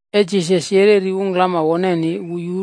E Jisas yereri ungklama woneni,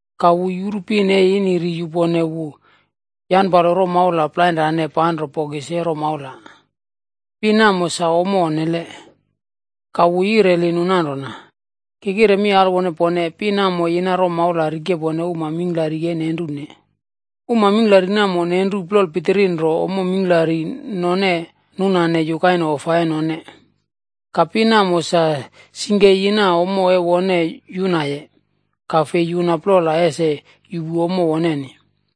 Ka wu yuru pin e ini ri yupone wu yanpalo romaula plainrane panro bokis e romaula. Pin namo sa ommo onnele. Ka wu yireli nu nanrona, “Ki kire mi alwone pone, pin namo yina romaula rikepone uma mingklari e nenrune. Uma mingklari namo nenru plol pitiri nro ommo mingklari none nunane yukaine ofa e none. Ka pin namo sa singke yina ommo e wone yunaye, ka fei yuna plola ese yuꞌpu ommo woneni.”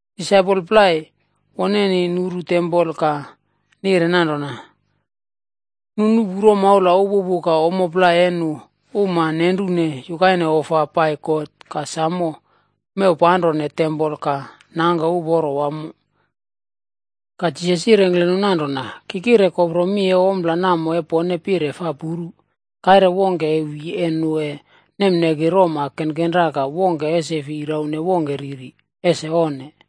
Disaipol plai woneni nuru tempol ka nire nanrona, “Nu nuꞌpu roma upupu ka ommo plai e nu uma nenrune yukaine ofa pai God ka samo mewpanrone tempol ka nangke uporo wamo.” Ka Jisas yirengkle nu nanrona, “Ki kire kopro mi e ompla namo e pone pire fa puru, kaire wongke e wi e nu e nemneki roma kenkenra ka wongke ese fi raune wongke riri. Ese onne!”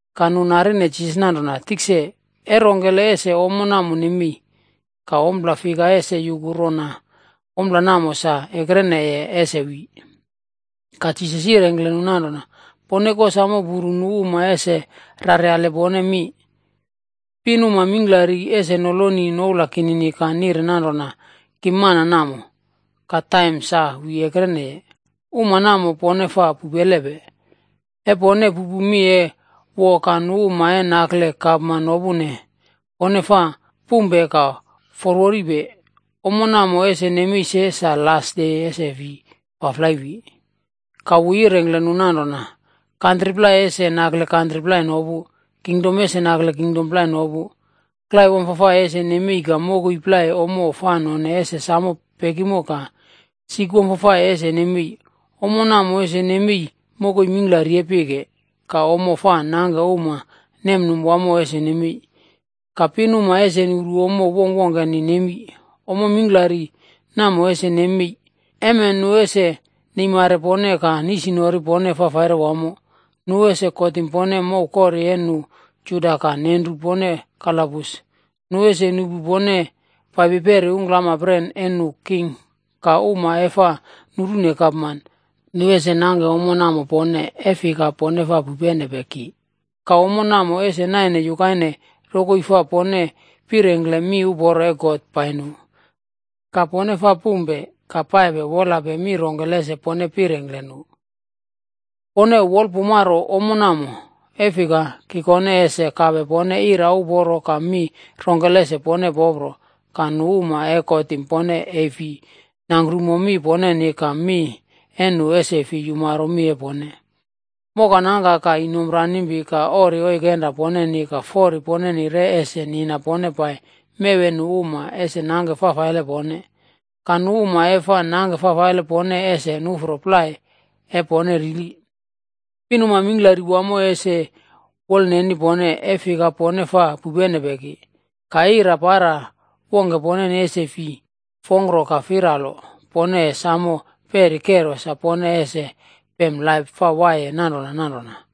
Ka nu narine Jisas nanrona, “Tikse, e rongkele ese ommo namo nemei? Ka ompla fika ese yuku rona ompla namo sa ekrene ese wi?” Ka Jisas yirengkle nu nanrona, “Pone kosamo puru nu uma ese raryale pone mi. Pinuma mingklari ese noloni noula kinini ka nire nanrona, ‘Ki mana namo,’ ka ‘Taim sa wi ekreneye.’ Uma namo, pone fa pupelepe. E pone pupu mi e woa ka nu uma e nakle gapman nopune, pone fa pumpe ka forworipe. Ommo namo ese nemei se, sa las de ese fi faflai wi.” Ka wu yirengkle nu nanrona, “Kantri plai ese nakle kantri plai nopu. Kingdom ese nakle kingdom plai nopu. Klai wamfafai ese nemei ka mokoi plai ommo fa none ese sam pekimo ka sik wamfafai ese nemei. Ommo namo ese nemei mokoi mingklari e pike. Ka ommo fa nangke uma nemnum wamo ese nemei. Ka pinuma ese nuru ommo wongkwongkeni nemi. “Ommo mingklari namo ese nemei, emen nu ese neimare pone ka nisnori pone fafaire wamo. Nu ese kotim pone mow kori e nu Juda ka nenru pone kalabus. Nu ese nuꞌpu pone paipi peri ungklampren e nu king ka uma e fa nurune gapman, nu ese nangke ommo namo pone, e fika, pone fa pupenepe ki. Ka ommo namo ese naine yukaine rokoi fa pone pirengkle mi uporo e God pai nu. Ka pone fa pumpe, ka paipe wolape mi rongkele ese pone pirengkle nu. Pone wolpumaro ommo namo. E fika, ki kone ese kape pone ira uporo ka mi rongkele ese pone popro, ka nu uma e kotim pone e fi nangkrumo mi poneni ka mi e nu ese fi yumaro mi e pone. Moka nangka ka inomp ranimpi ka ori oikenra poneni ka fori poneni re ese nina pone pai mew e nu uma ese nangke fafaile pone. Ka nu uma e fa nangke fafaile pone ese nuꞌfro plai e pone rili. Pinuma mingklari wamo ese wolneni pone, e fika pone fa pupenepe ki. Ka ira para wongke poneni ese fi fongkro ka firalo. Pone e samo peri kero sa pone ese pem laip fa waiye nanrona nanrona.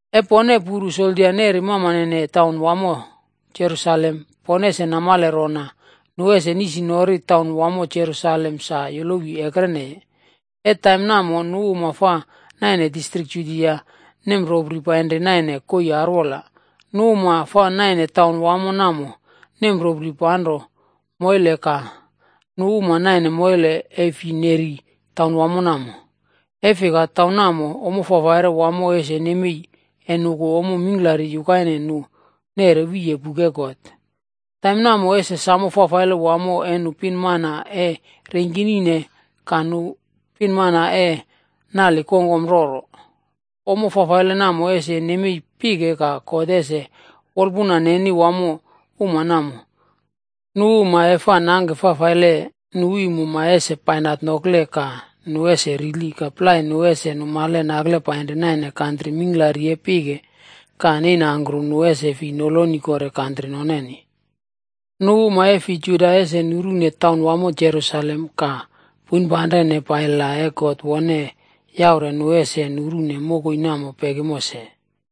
“E pone puru soldia neri mamane taunwamo Jerusalem, pone ese namale rona nu ese nisnori taunwamo Jerusalem sa yolowi ekreneye. E taim namo nu uma fa naine distrik Judia nemropri painri naine koii arwola. Nu uma fa naine taun wamo namo nemropri panro moile ka nu uma naine moile e fi neri taun wamo namo. E fika taim namo, ommo fafaire wamo ese nemei e nuku ommo mingklari yukaine nu neꞌre wiye buk e God. Taim namo ese sam fafaile wamo e nu pinmana e reingkinine ka nu pinmana e naline kongkom roro. Ommo fafaile namo ese nemei pike ka God ese wolpuna neni wamo uma namo. Nu uma e fa nangke fafaile, nu iim uma ese bainat nokle ka nu ese rili ka plai nu ese numale nakle painri naine kantri mingklari e pike ka neinangkru nu ese fi noloni kore kantri noneni. Nu uma e fi Juda ese nurune taunwamo Jerusalem ka poinpanrene pai la taim God wone yaure nu ese nurune mokoi namo pekimo se.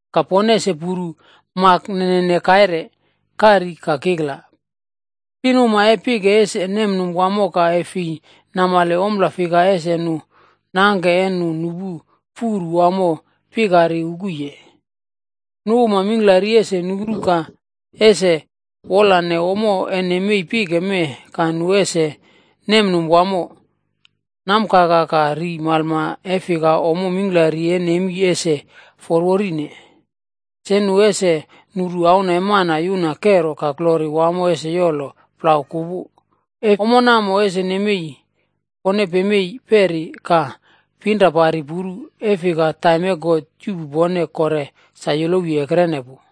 “Ka pone ese puru mak nene kaire, kari ka kikla. Pinuma e pike ese nemnum wamo ka e fi namale ompla fika ese nu nangke e nu nupu furu wamo pikari ukuye. Nu uma mingklari ese nuru ka ese wolane ommo ese nemei pike mee ka nu ese nemnum wamo, nam kaka ka ri malma e fika ommo kero mingklari e nemi ese forworine. Se nu ese nuru Auna e Mana yuna kero ka glori wamo ese yolo plau kupu. E ommo namo ese nemei, pone pemei peri ka pinrapari puru, e fika taim e God yuꞌpu pone kore sa yolowi ekrene pu.”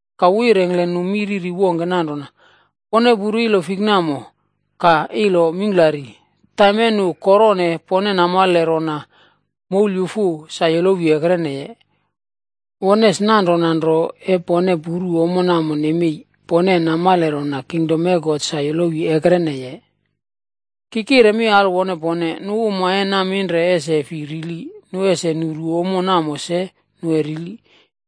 Ka wu yirengkle nu mi riri wongke nanrona, “Pone puru ilo fikb namo ka ilo mingklari. Taim e nu korone pone namale rona moulyufu sa yolowi ekreneye. Won es nanrona nro e pone puru ommo namo nemei, pone e namale rona kingdom e God sa yolowi ekreneye. “Ki kire mi alwone pone, nu uma e naminre ese fi rili, nu ese nuru ommo namo se nu e rili.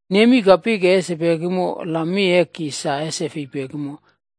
Nemi ka pike ese pekimo, la mi e ki sa ese fei pekimo.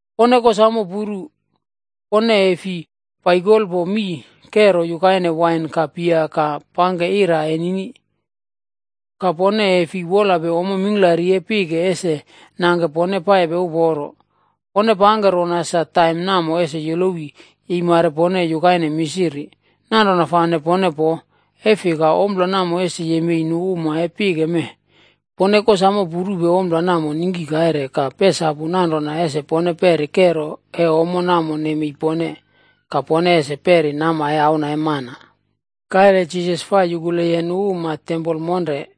“Pone kosamo puru, pone e fi paikolpo mii kero yukaine wain ka bia ka pangke ira enini, ka pone e fi wolape ommo mingklari e pike ese nangke pone paipe uporo. Pone pangke rona sa taim namo ese yolowi yeimare pone yukaine misiri. Nanrona fane pone poo. E fika ompla namo ese yemei nu uma e pike mee. Pone kosamo purupe ompla namo ningki kaire ka pesapupe nanrona ese pone peri kero e ommo namo nemei pone, ka pone ese peri nama e Auna e Mana.” Kaire Jisas fa yukuleye nu uma tempol monre.